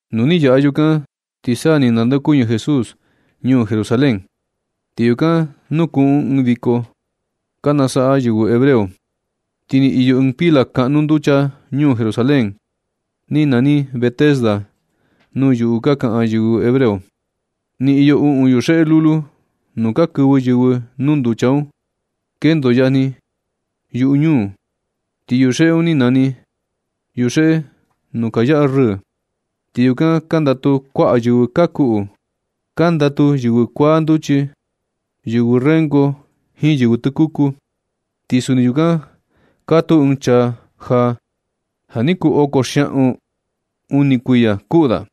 Nu ni yaꞌa yukan na ti sa ni nandeokuñɨ Jesús ñuu Jerusalén, ti yukan nukuꞌun ɨɨn viko ka nasaꞌa yɨvɨ hebreo. Ni iyo ɨɨn pila kaꞌnu nducha ñuu Jerusalén. Ni nani Betesda nuu yuꞌu ka kaꞌan yɨvɨ hebreo. Ni iyo uꞌun yuxeꞌe lulu nuu ka kɨvɨ yɨvɨ nuu nducha un. Kendo yajni yuꞌu ñuu, ti yuxeꞌe un ni nani Yuxeꞌe Nuu Ka Yaꞌa Rɨɨ. Ti yukan kandatu kuaꞌa yɨvɨ ka kuꞌu. Kandatu yɨvɨ kuaa nduchi, yɨvɨ rengo jiin yɨvɨ tɨkuku. Ti suni yukan katuu ɨɨn chaa ja ja ni kuu oko xiaꞌun uni kuiya kuꞌu da.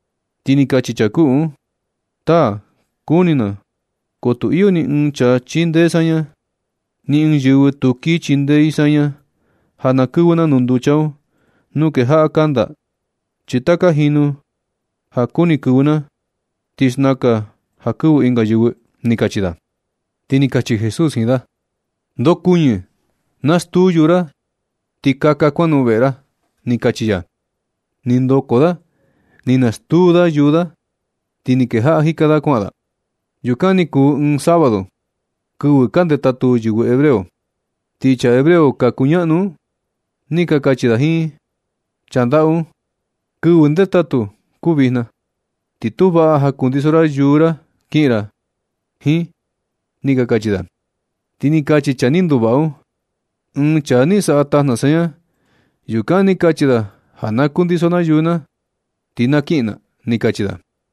Ti ni kachi chaa kuꞌu un: ―Taa, kuni na, ko tu iyo ni ɨɨn chaa chindee saña. Ni ɨɨn yɨvɨ tu kii chindee i saña ja na kɨvɨ na nuu nducha un nuu kejaꞌa kanda. Chi taka jinu ja kuni kɨvɨ na, ti xnakan ja kɨvɨ ɨnga yɨvɨ ―ni kachi da. Ti ni kachi Jesús jiin da: ―¡Ndokuñɨ! Nastuu yuu ra, ti kaka kuanoꞌon veꞌe ra ―ni kachi ya. Ni ndoko da ni nastuu da yuu da, ti ni kejaꞌa jika da kuaꞌan da. Yukan ni kuu ɨɨn sabado, kɨvɨ ka ndetatu yɨvɨ hebreo. Ti chaa hebreo ka kuñaꞌnu un, ni ka kachi da jiin chaa ndaꞌu un: ―Kɨvɨ ndetatu kuu vijna, ti tu vaꞌa ja kundiso ra yuu ra kiꞌin ra jiin ―ni ka kachi da. Ti ni kachi chaa ni nduvaꞌa un: ―Ɨɨn chaa ni saꞌa tajna saña yukan ni kachi da ja na kundiso na yuu na ti na kiꞌin na ―ni kachi da.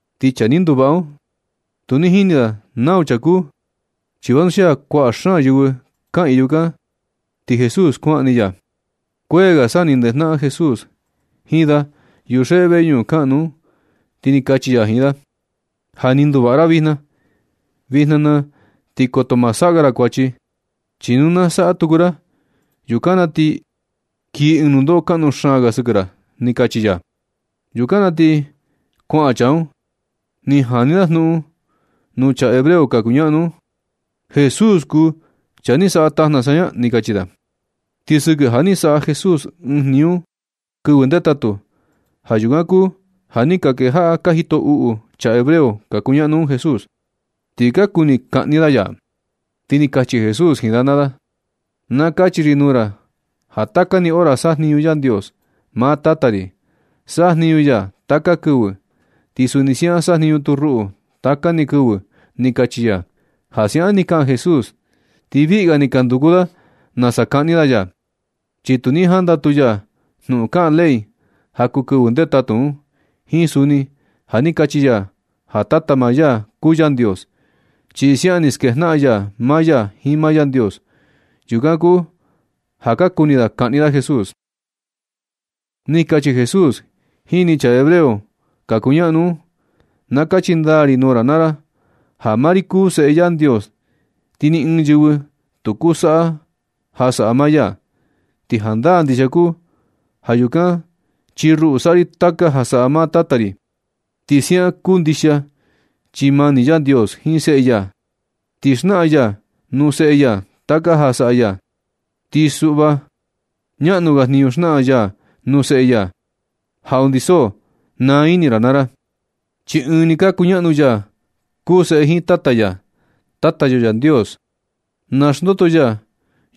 Ti chaa ni nduvaꞌa un, tu ni jini da nau chaa kuu, chi vanuxia kuaꞌa xaan yɨvɨ kaꞌiin yukan, ti Jesús kuaꞌan ni ya. Kuee ga sa ni ndejnaꞌan Jesús jiin da yuxeꞌe veñuꞌun kaꞌnu un, ti ni kachi ya jiin da: ―Ja ni nduvaꞌa ra vijna. Vijna na ti koto ma saꞌa ga ra kuachi. Chi nu na saꞌa tuku ra, yukan na ti kii ɨɨn nundoꞌo kaꞌnu xaan ga sɨkɨ ra ―ni kachi ya. Yukan na ti kuaꞌan chaa un, ni jani da jnuꞌun nuu chaa hebreo ka kuñaꞌnu un: ―Jesús kuu ja ni saꞌa tajna saña ―ni kachi da. Ti sɨkɨ ja ni saꞌa Jesús ɨɨn jniñu un kɨvɨ ndetatu, ja yukan kuu ja ni ka kejaꞌa ka jito uꞌu chaa hebreo ka kuñaꞌnu un Jesús, ti ka kuni kaꞌni da ya. Ti ni kachi Jesús jiin da naa da: ―Na kachi ri nuu ra ja taka ni hora sajniñu Yandios. Maa Tata ri, sajniñu ya taka ni kɨvɨ. Ti suni siaꞌan sajniñu tu ruꞌu taka ni kɨvɨ ―ni kachi ya. Ja siaꞌan ni kaꞌan Jesús, ti viꞌi ga ni ka nduku da nasa kaꞌni da ya, chi tu ni jandatu ya jnuꞌun kaꞌan ley ja kuu kɨvɨ ndetatu un, jiin suni ja ni kachi ya ja Tata maa ya kuu Yandios, chi siaꞌan ni skejnaꞌan ya maa ya jiin maa Yandios. Yukan kuu ja ka kuni da kaꞌni da Jesús. Ni kachi Jesús jini chaa hebreo ka kuñaꞌnu un: ―Na kachi ndaa ri nuu ra naa ra ja maa ri kuu Seꞌe Yandios, ti ni ɨɨn yɨvɨ tu kuu saꞌa ja saꞌa maa ya. Ti jandaa ndixia kuu yukan chi ruꞌu saꞌa ri taka ja saꞌa maa Tata ri. Ti siaꞌan kuu ndixia chi mani Yandios jiin Seꞌe ya, ti xnaꞌan ya nuu Seꞌe ya taka ja saꞌa ya. Ti suꞌva ñaꞌnu ga jniñu xnaꞌan ya nuu seꞌe ya, ja undi so naa ini ra naa ra. Chi Ɨɨn ni ka kuñaꞌnu ya kuu Seꞌe jiin Tata ya. Tata yo Yandios, naxndoto ya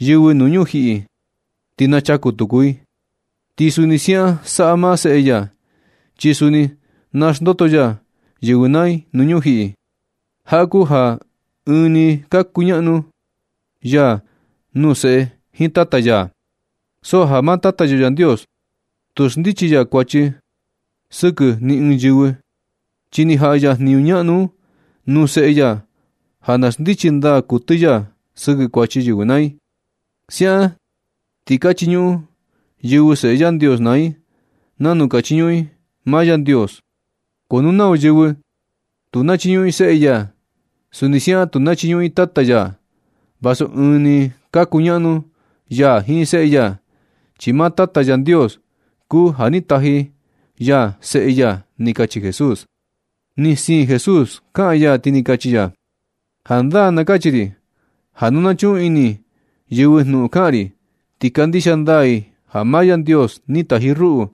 yɨvɨ nuu ñujiꞌi, ti nachaku tuku i. Ti suni siaꞌan saꞌa maa seꞌe ya, chi suni naxndoto ya yɨvɨ naa i nuu ñujiꞌi. Jaꞌa kuu ja ɨɨn ni kuñaꞌnu ya kuu Seꞌe jiin Tata ya. So ja maa Tata yo Yandios tu xndichi ya kuachi sɨkɨ ni ɨɨn yɨvɨ, chi ni jaꞌa ya jniñu ñaꞌnu un nuu Seꞌe ya ja na xndichi ndaa kuɨtɨ ya sɨkɨ kuachi yɨvɨ naa i. Siaꞌan ti na chiñuꞌun yɨvɨ Seꞌe Yandios naa i nanu ka chiñuꞌun i maa Yandios. Ko nu nau yɨvɨ tu nachiñuꞌun Seꞌe ya, suni siaꞌan tu nachiñuꞌun i Tata ya, vasu ɨɨn ni ka kuñaꞌnu ya jiin Seꞌe ya, chi maa Tata Yandios kuu ja ni taji ya Seꞌe ya ―ni kachi Jesús. Ni siin Jesús kaꞌan ya ti ni kachi ya: ―Jandaa na kachi ri ja nu na chuꞌun ini yɨvɨ jnuꞌun kaꞌan ri, ti kandixia ndaa i ja maa Yandios ni taji ruꞌu,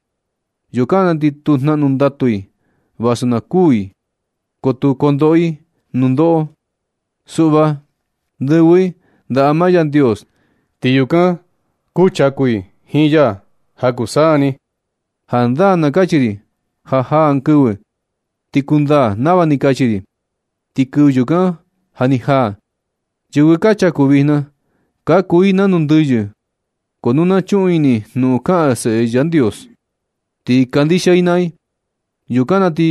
yukan na ti tu jnaꞌnu ndatu i. Vasu na kuu i ko tu kondoꞌo i nundoꞌo. Suꞌva ndɨvɨ i ndaꞌa maa Yandios ti yukan kuchaku i jiin ya ja kuu saa ni. Jandaa na kachi ri ja jaa ɨɨn kɨvɨ ti kundaa nava ni kachi ri, ti kɨvɨ yukan ja ni jaa. Yɨvɨ ka chaku vijna, ka kuu i nanu ndɨyɨ, ko nu na chuꞌun ini i jnuꞌun kaꞌan Seꞌe Yandios, ti kandixia i naa i, yukan na ti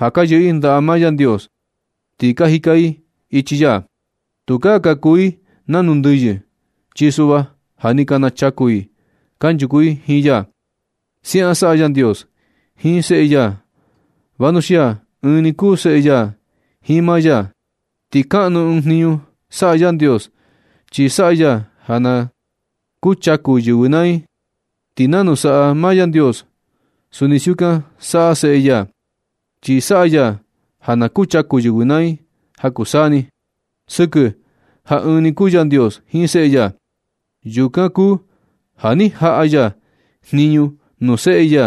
ja ka yɨꞌɨ i ndaꞌa maa Yandios, ti ka jika i ichi ya. Tukaa ka kuu i nanu ndɨyɨ, chi suꞌva ja ni ka nachaku i kanchuku i jiin ya. Siaꞌan saꞌa Yandios jiin Seꞌe ya vanuxia ɨɨn ni kuu seꞌe ya jiin maa ya. Ti kaꞌnu ɨɨn jniñu saꞌa Yandios chi saꞌa ya ja na kuchaku yɨvɨ naa i. Ti nanu saꞌa maa Yandios suni siukan saꞌa Seꞌe ya, chi saꞌa ya ja na kuchaku yɨvɨ naa i ja kuu saa ni. Sɨkɨ ja ɨɨn ni kuu Yandios jiin Seꞌe ya, yukan kuu ja ni jaꞌa ya jniñu nuu Seꞌe ya,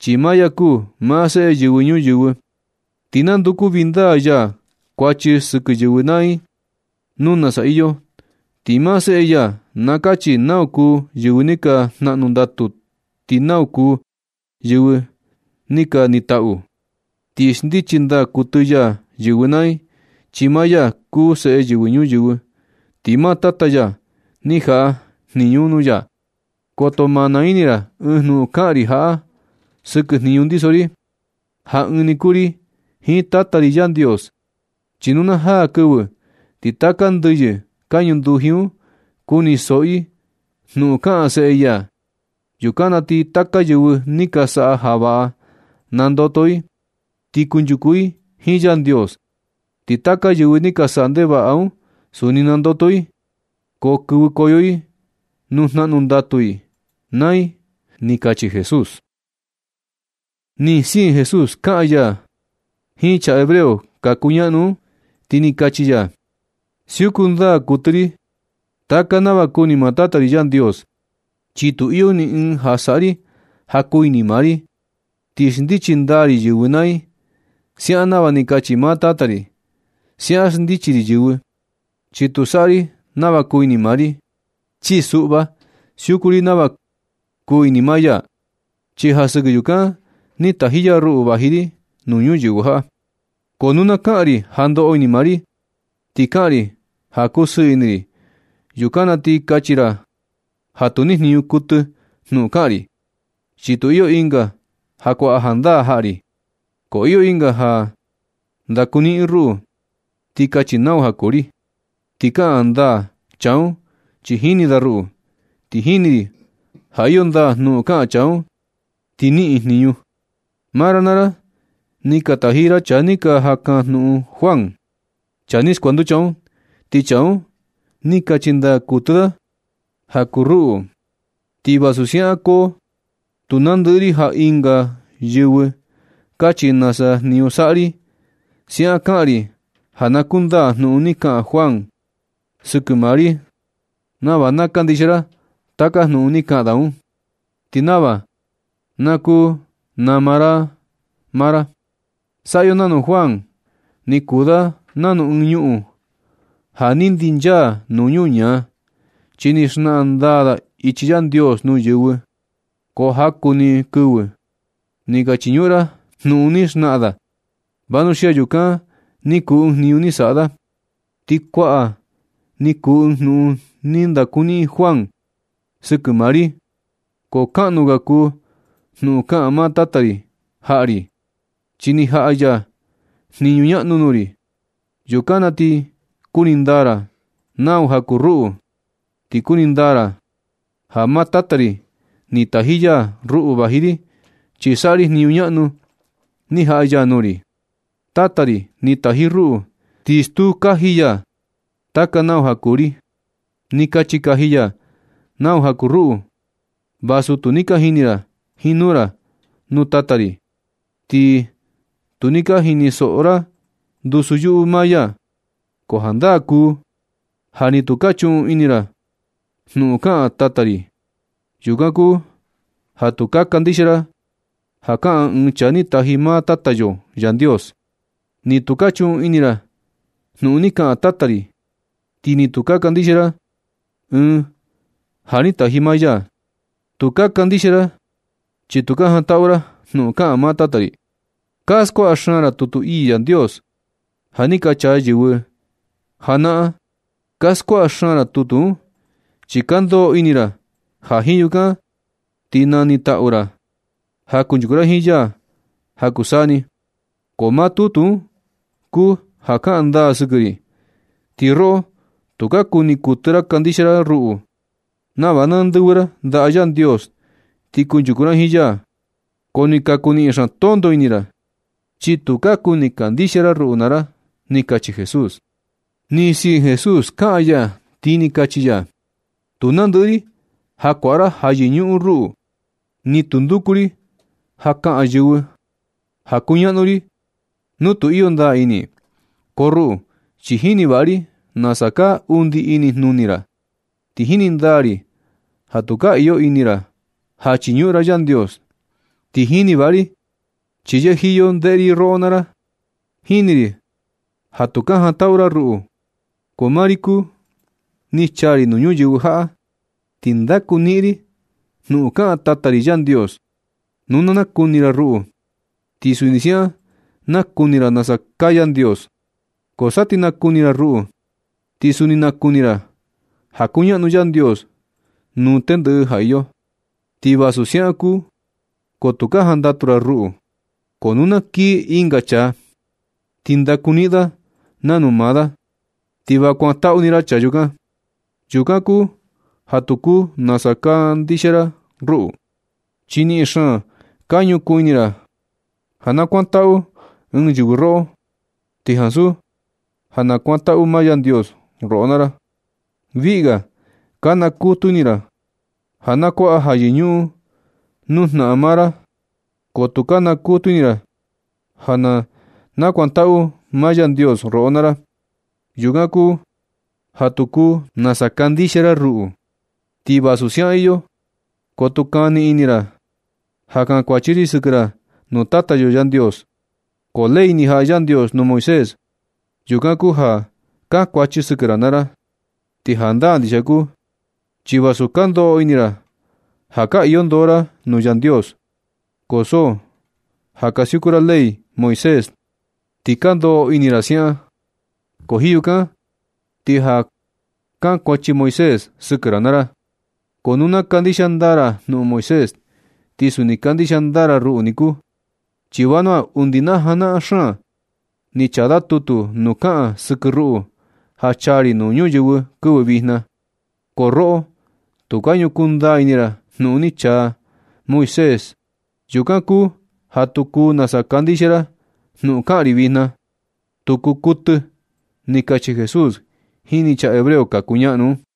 chi maa ya kuu maa Seꞌe Yɨvɨ Ñuyɨvɨ. Ti nanduku vindaa ya kuachi sɨkɨ yɨvɨ naa i nuu nasa iyo. Ti maa Seꞌe ya na kachi nau kuu yɨvɨ ni ka jnaꞌnu ndatu, ti nau kuu yɨvɨ ni ka nitaꞌu. Ti xndichi ndaa kuɨtɨ ya yɨvɨ naa i, chi maa ya kuu Seꞌe Yɨvɨ Ñuyɨvɨ, ti maa Tata ya ni jaꞌa jniñu un nuu ya. Koto ma naa ini ra ɨɨn jnuꞌun kaꞌan ri jaꞌa sɨkɨ jniñu ndiso ri, ja ɨɨn ni kuu ri jiin Tata ri Yandios, chi nu na jaa kɨvɨ, ti taka ndɨyɨ ka ñunduji un kunisoꞌo i jnuꞌun kaꞌan Seꞌe ya. Yukan na ti taka yɨvɨ ni ka saꞌa ja vaꞌa, nandoto i ti kunchuku i jiin Yandios. Ti taka yɨvɨ ni ka saꞌa ndevaꞌa un suni nandoto i, ko kɨvɨkoyo i nuu jnaꞌnu ndatu i naa i ―ni kachi Jesús. Ni siin Jesús kaꞌan ya jiin chaa hebreo ka kuñaꞌnu un, ti ni kachi ya: ―Siuku ndaa kuɨtɨ ri taka nava kuni maa Tata ri Yandios, chi tu iyo ni ɨɨn ja saꞌa ri ja kuu ini maa ri. Ti xndichi ndaa ri yɨvɨ naa i siaꞌan nava ni kachi maa Tata ri. Siaꞌan xndichi ri yɨvɨ, chi tu saꞌa ri nava kuu ini maa ri. Chi suꞌva siuku ri nava kuu ini maa ya, chi ja sɨkɨ yukan ni taji ya ruꞌu vaji ri nuu ñuyɨvɨ jaꞌa. Ko nu na kaꞌan ri ja ndoꞌo ini maa ri, ti kaꞌan ri ja kusɨɨ ini ri, yukan na ti kachi ra ja tu nijniñu kuɨtɨ jnuꞌun kaꞌan ri, chi tu iyo ɨnga ja kuaꞌa jandaa jaꞌa ri. Ko iyo ɨnga ja ndakuniꞌin ruꞌu ti kachi nau ja kuu ri, ti kaꞌan ndaa chaa un chi jini da ruꞌu. Ti jini ri ja iyo ndaa jnuꞌun kaꞌan chaa un ti niꞌin jniñu. Maa ra naa ra, ni ka taji ra chaa ni ka jaꞌan kajnuꞌun Juan, chaa ni skuanducha un. Ti chaa un, ni kachi ndaa kuɨtɨ ni da ja kuu ruꞌu. Ti vasu siaꞌan ko tu nandɨꞌɨ ri ja ɨnga yɨvɨ kachi nasa jniñu saꞌa ri. Siaꞌan kaꞌan ri ja na kundaa jnuꞌun ni kaꞌan Juan sɨkɨ maa ri nava na kandixia ra taka jnuꞌun ni kaꞌan da un, ti nava na kuu nama ra maa ra. Saꞌa yo nanu Juan ni kuu da nanu ɨɨn ñuꞌun ja ni ndinchaa nuu ñuñaa, chi ni xnaꞌan ndaa da ichi Yandios nuu yɨvɨ. Ko jaku ni kɨvɨ ni ka chiñuꞌun ra jnuꞌun ni xnaꞌan da un. Vanuxia yukan ni kuu ɨɨn jniñu ni saꞌa da. Ti kuaꞌa ni kuu ɨɨn jnuꞌun ni ndakuniꞌin Juan sɨkɨ maa ri. Ko kaꞌnu ga kuu jnuꞌun kaꞌan maa Tata ri jaꞌa ri, chi ni jaꞌa ya jniñu ñaꞌnu nuu ri. Yukan na ti kuni ndaa ra nau ja kuu ruꞌu, ti kuni ndaa ra ja maa Tata ri ni taji ya ruꞌu vaji ri, chi saꞌa ri jniñu ñaꞌnu ni jaꞌa ya nuu ri. Tata ri ni taji ruꞌu, ti stuu kaji ya taka nau ja kuu ri. Ni kachi kaji ya nau ja kuu ruꞌu, vasu tu ni ka jini ra jiin nuu ra nuu Tata ri, ti ni tu ni ka jinisoꞌo ra ndusu yuꞌu maa ya. Ko jandaa kuu ja ni tu ka chuꞌun ini ra jnuꞌun kaꞌan Tata ri. Yukan kuu ja tu ka kandixia ra ja kaꞌan ɨɨn Chaa ni taji maa Tata yo Yandios. Ni tu ka chuꞌun ini ra jnuꞌun ni kaꞌan Tata ri. Ti ni tu ka kandixia ra Ɨɨn ja ni taji maa ya. Tu ka kandixia ra, chi tu ka jantaꞌu ra jnuꞌun kaꞌan maa Tata ri. Ka skuaꞌa xaan ra tutu ii Yandios ja ni ka chaa yɨvɨ janaꞌan. Ka skuaꞌa xaan ra tutu un, chi ka ndoꞌo ini ra ja jiin yukan ti na nitaꞌu ra ja kunchuku ra jiin ya ja kuu saa ni. Ko maa tutu un kuu ja kaꞌan ndaa sɨkɨ ri. Ti roꞌo tu ka kuni kuɨtɨ ra kandixia ra ruꞌu nava na ndɨvɨ ra ndaꞌa Yandios ti kunchuku ra jiin ya. Ko ni ka kuu niꞌin xaan tonto ini ra, chi tu ka kuni kandixia ra ruꞌu naa ra ―ni kachi Jesús. Ni siin Jesús kaꞌan ya ti ni kachi ya: ―Tu nandɨꞌɨ ri ja kuaꞌa ra ja yɨñuꞌun ruꞌu. Ni tu nduku ri ja kaꞌan yɨvɨ ja kuñaꞌnu ri nu tu iyo ndaa ini i. Ko ruꞌu chi jini vaꞌa ri nasa kaa undi ini jnuni ra. Ti jini ndaa ri ja tu ka iyo ini ra ja chiñuꞌun ra Yandios, ti jini vaꞌa ri chi yɨjiyo ndeꞌe ri roꞌo naa ra. Jini ri ja tu ka jantaꞌu ra ruꞌu. Ko maa ri kuu, ni chaa ri nuu ñuyɨvɨ jaꞌa ti ndaku niꞌin ri jnuꞌun kaꞌan Tata ri Yandios. Nu na nakuni ra ruꞌu, ti suni siaꞌan nakuni ra nasa kaa Yandios. Ko sa ti nakuni ra ruꞌu, ti suni nakuni ra ja kuñaꞌnu Yandios nuu tendɨꞌɨ ja iyo. Ti vasu siaꞌan kuu, ko tu ka jantaꞌu ra ruꞌu. Ko nu na kii ɨnga chaa, ti ndakuniꞌin da nanu maa da, ti va kuantaꞌu ni ra chaa yukan. Yukan kuu ja tu kuu nasa kandixia ra ruꞌu, chi niꞌin xaan ka ñukuu ini ra ja na kuantaꞌu ɨɨn yɨvɨ roꞌo, ti ansu ja na kuantaꞌu maa Yandios roꞌo naa ra. Viꞌi ga ka nakutu ini ra ja, nakuaꞌa ja yɨñuꞌun nuu jnaꞌan maa ra, ko tu ka nakutu ini ra ja na nakuantaꞌu maa Yandios roꞌo naa ra. Yukan kuu ja tu kuu nasa kandixia ra ruꞌu. Ti vasu siaꞌan iyo, ko tu kani ini ra ja kankuachi ri sɨkɨ ra nuu Tata yo Yandios. Ko ley ni jaꞌa Yandios nuu Moisés, yukan kuu ja kankuachi sɨkɨ ra naa ra. Ti jandaa ndixia kuu, chi vasu ka ndoꞌo ini ra ja ka iyo ndoo ra nuu Yandios, ko so ja ka siuku ra ley Moisés ti ka ndoꞌo ini ra siaꞌan. Ko jiin yukan ti ja kankuachi Moisés sɨkɨ ra naa ra. Ko nu ka kandixia ndaa ra jnuꞌun Moisés, ti suni kandixia ndaa ra ruꞌu niku. Chi vanua undi na janaꞌan xaan ni chaa da tutu nuu kaꞌan sɨkɨ ruꞌu ja chaa ri nuu ñuyɨvɨ kɨvɨ vijna. Ko roꞌo tu ka ñukuu ndaa ini ra jnuꞌun ni chaa Moisés. Yukan kuu ja tu kuu nasa kandixia ra jnuꞌun kaꞌan ri vijna. Tu kuu kuɨtɨ ―ni kachi Jesús jini chaa hebreo ka kuñaꞌnu un.